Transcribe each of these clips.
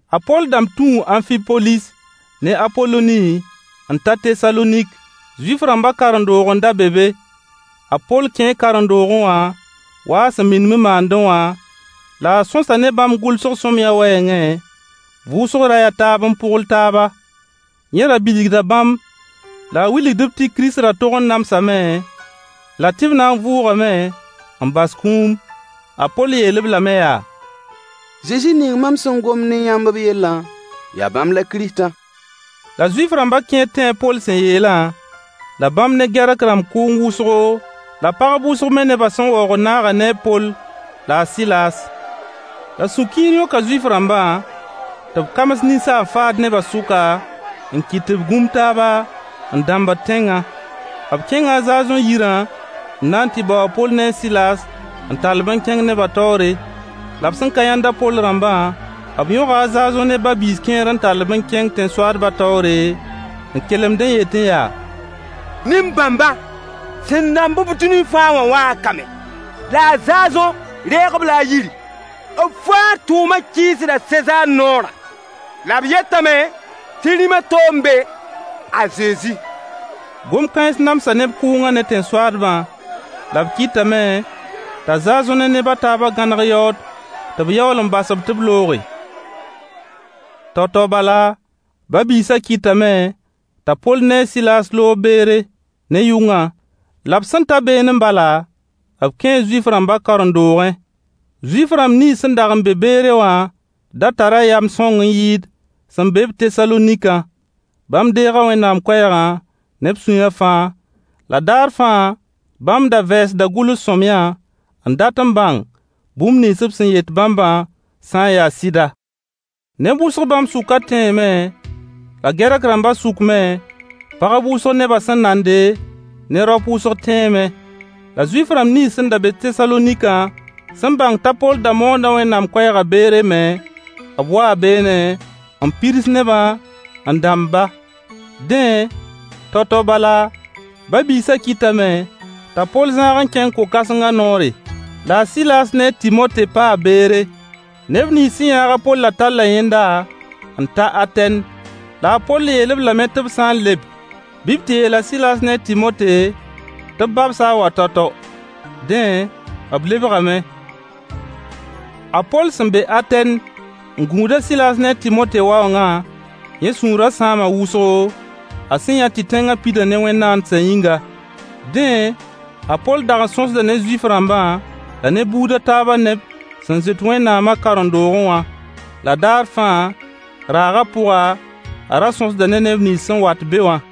A Poll dãmb tũu Amfipolis ne Apoloni n ta Tesalonik. Zuif-rãmbã karen-doog n da be be. A Poll kẽe karen-doogẽ wã wa a sẽn minim n maandẽ wã, La a sõsa ne bãmb gʋlsg sõamyã wɛɛngẽ, vʋʋsg ray a taab n pʋgl taaba. Yẽ ra bilgda bãmb la a wilgd-b tɩ Kirist da tog n namsame, la tɩ b na n vʋʋgame n bas kũum. A Poll yeel-b lame yaa: Zezi ning mam sẽn gomd ne yãmb b yellã, yaa bãmb la Kiristã. La Zuif-rãmbã kẽer tẽe a Poll sẽn yeelã, la bãmb ne Gɛrk-rãmb kʋʋng wʋsgo, la pagb wʋsg me nebã sẽn waoogd naaga ne a Poll la a Sɩlaas. La sũ-kiir yõka Zuif-rãmbã tɩ b kams ninsaan-faad neba sʋka, n kɩt tɩ b gũm taaba, n dambd tẽngã. B kẽnga a Zaazõ yirã n na n tɩ bao a Poll ne a Sɩlaas n tall-b n kẽng nebã taoore. La b sẽn ka yãnd a Poll rãmba, b yõga a Zaazõ ne ba-biis kẽer n tall-b n kẽng tẽn-soaadbã taoore, n kelemd n yetẽ yaa: Nin bãmbã, sẽn dãmb-b dũni fãa wã waa ka me, la a Zaazõ reeg-b-la a yiri. B fãa tʋʋmã kɩɩsda Sezaar noorã, la b yetame tɩ rĩm a to n be: a Zezi. Gom-kãens namsa neb kʋʋngã ne tẽn-soaadbã. La b kɩtame t'a Zaazõ ne neb a taabã gãneg yaood tɩ b yaool n bas-b tɩ b looge. Tao-tao bala, ba-biisã kɩtame t'a Poll ne a Sɩlaas loog Beere ne yʋngã. La b sẽn ta beene bala, b kẽe Zuif-rãmba karen-doogẽ. Zuif-rãmb nins sẽn dag n be Beere wã da tara yam sõng n yɩɩd sẽn be-b Tesalonikã. Bãmb deega Wẽnnaam koɛɛgã ne b sũyã fãa. La daar fãa, bãmb da vɛɛsda gʋls sõamyã n dat n bãng bũmb nins b sẽn yet bãmbã sã n yaa a sɩda. Neb wʋsg bãmb sʋkã tẽeme, la Gɛrk-rãmba sʋk me, pagb wʋsg nebã sẽn nande, ne raop wʋsg tẽeme. La Zuif-rãmb nins sẽn be Tesalonikã sẽn bãng t'a Poll da moonda Wẽnnaam koɛɛgã Beere me, b waa beene, n pirs nebã, n dãmb-ba. Dẽ, tao-tao bala, ba-biisã kɩtame t'a Poll zãag n kẽng ko-kãsengã noore. La a Sɩlaas ne a Tɩmote paa Beere. Neb nins sẽn yãag a Pollã talla yẽnda n ta Atɛn. La a Poll yeel-b lame tɩ b sã n leb bɩ b tɩ yeel a Sɩlaas ne a Tɩmote tɩ b babs-a n wa tao-tao. Dẽ, b lebgame. A Poll sẽn be Atɛn n gũud a Sɩlaas ne a Tɩmote waoongã, yẽ sũurã sãama wʋsgo, a sẽn yã tɩ tẽngã pida ne wẽn-naandsã yĩnga. Dẽ, a Poll dag n sõsda ne Zuif-rãmbã, la ne buud a taabã neb sẽn zoet Wẽnnaamã karen-doogẽ wã. La daar fãa, raagã pʋga, a ra sõsda ne neb nins sẽn wat be wã.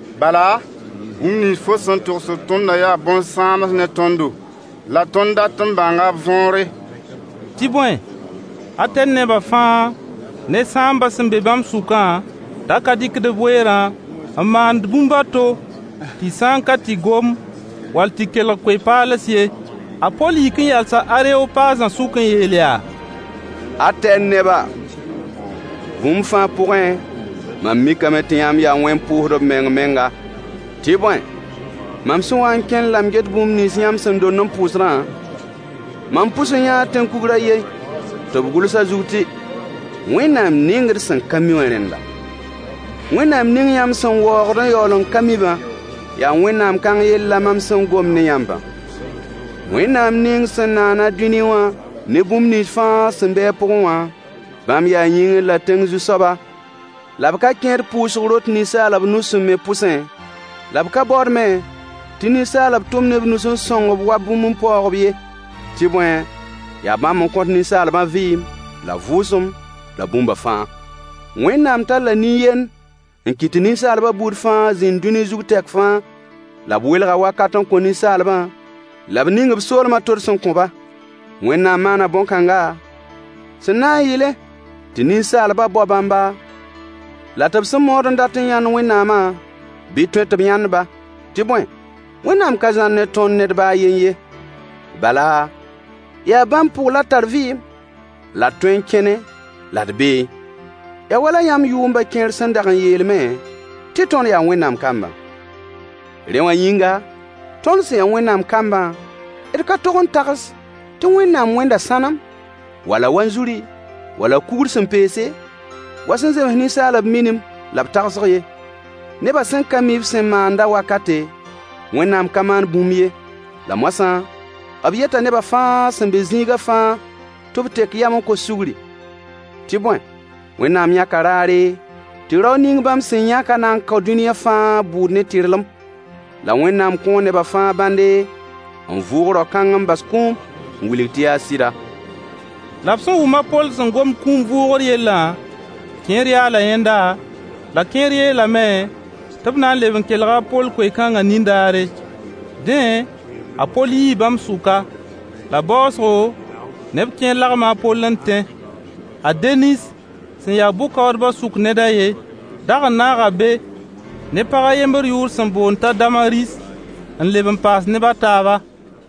Bala, bũmb nins fo sẽn togsd tõndã yaa bõn-sãams ne tõndo, la tõnd dat n bãnga b võore. Tɩ bõe, Atɛn neba fãa ne sãambã sẽn be bãmb sʋkã da ka rɩkd b weerã n maand bũmb a to tɩ sã n ka tɩ gom, wall tɩ kelg koe-paals ye. A Poll yik n yalsa Areopaazã sʋk n yeel yaa: Atɛn neba, bũmb fãa pʋgẽ, mam mikame tɩ yãmb yaa wẽn-pʋʋsdb meng-menga. Tɩ bõe, mam sẽn wa n kẽnd la m get bũmb nins yãmb sẽn dond n pʋʋsdã, mam pʋs n yãa tẽn-kugr a yen tɩ b gʋls a zug tɩ “wẽnnaam ning d sẽn ka mi wã rẽnda.” Wẽnnaam ning yãmb sẽn waoogd n yaool n ka mi-bã, yaa Wẽnnaam kãng yell la mam sẽn gomd ne yãmbã. Wẽnnaam ning sẽn naan-a dũni wã ne bũmb nins fãa sẽn be a pʋgẽ wã, bãmb yaa yĩngr la tẽng Zu-soaba, la b ka kẽed pʋʋsg rot ninsaalb nus sẽn me pʋsẽ, la b ka baood me tɩ ninsaalb tʋm ne b nus n sõng-b wa bũmb n paoog-b ye. Tɩ bõe, yaa bãmb n kõt ninsaalbã vɩɩm, la vʋʋsem, la bũmbã fãa. Wẽnnaam talla nin-yend n kɩt tɩ ninsaalbã buud fãa zĩnd dũni zug tɛk fãa, la b welga wakat n kõ ninsaalbã, la b ning b soolmã tods n kõ-ba. Wẽnnaam maana bõn-kãnga, sẽn na n yɩlẽ tɩ ninsaalba bao bãmba, la tɩ b sẽn maood n dat n yãnd Wẽnnaamã, bɩ tõe tɩ b yãnd-ba. Tɩ bõe, Wẽnnaam ka zãr ne tõnd ned ba a yen ye, bala, yaa bãmb pʋg la d tar vɩɩm, la d tõe n kẽne la d beẽ. Yaa wala yãmb yʋʋmba kẽer sẽn dag n yeel me tɩ tõnd yaa Wẽnnaam koãmbã. Rẽ, wã yĩnga, tõnd sẽn ya Wẽnnaam kambã, d ka tog n tags tɩ Wẽnnaam wẽnda sãnem, wala wanzuri, wala kugr sẽn peese wa sẽn zems ninsaalb minim la b tagsg ye. Neba sẽn ka mi b sẽn maanda wakate, Wẽnnaam ka maand bũmb ye, La moasã, b yeta nebã fãa sẽn be zĩiga fãa tɩ b tek yam n kos sugri. Tɩ bõe, Wẽnnaam yãka raare tɩ rao ning bãmb sẽn yãkã na n kao dũniyã fãa bʋʋd ne tɩrlem. La Wẽnnaam kõo neba fãa bãnde n vʋʋg rao-kãng n bas kũum n wilg tɩ yaa sɩda. La b sẽn wʋm a Poll sẽn gomd kũum vʋʋgr yellã, kẽer yaala yẽnda, la kẽer yeelame tɩ b na n leb n kelga a Poll koe-kãnga nindaare. Dẽ, a Poll yii bãmb sʋka. La baoosgo neb kẽer lagma a Poll n tẽ. A Denis sẽn ya bʋ-kaoodba sʋk ned a yen dag n naaga be, ne pag a yembr yʋʋr sẽn boond t'a Damaris n leb n paas neb a taaba.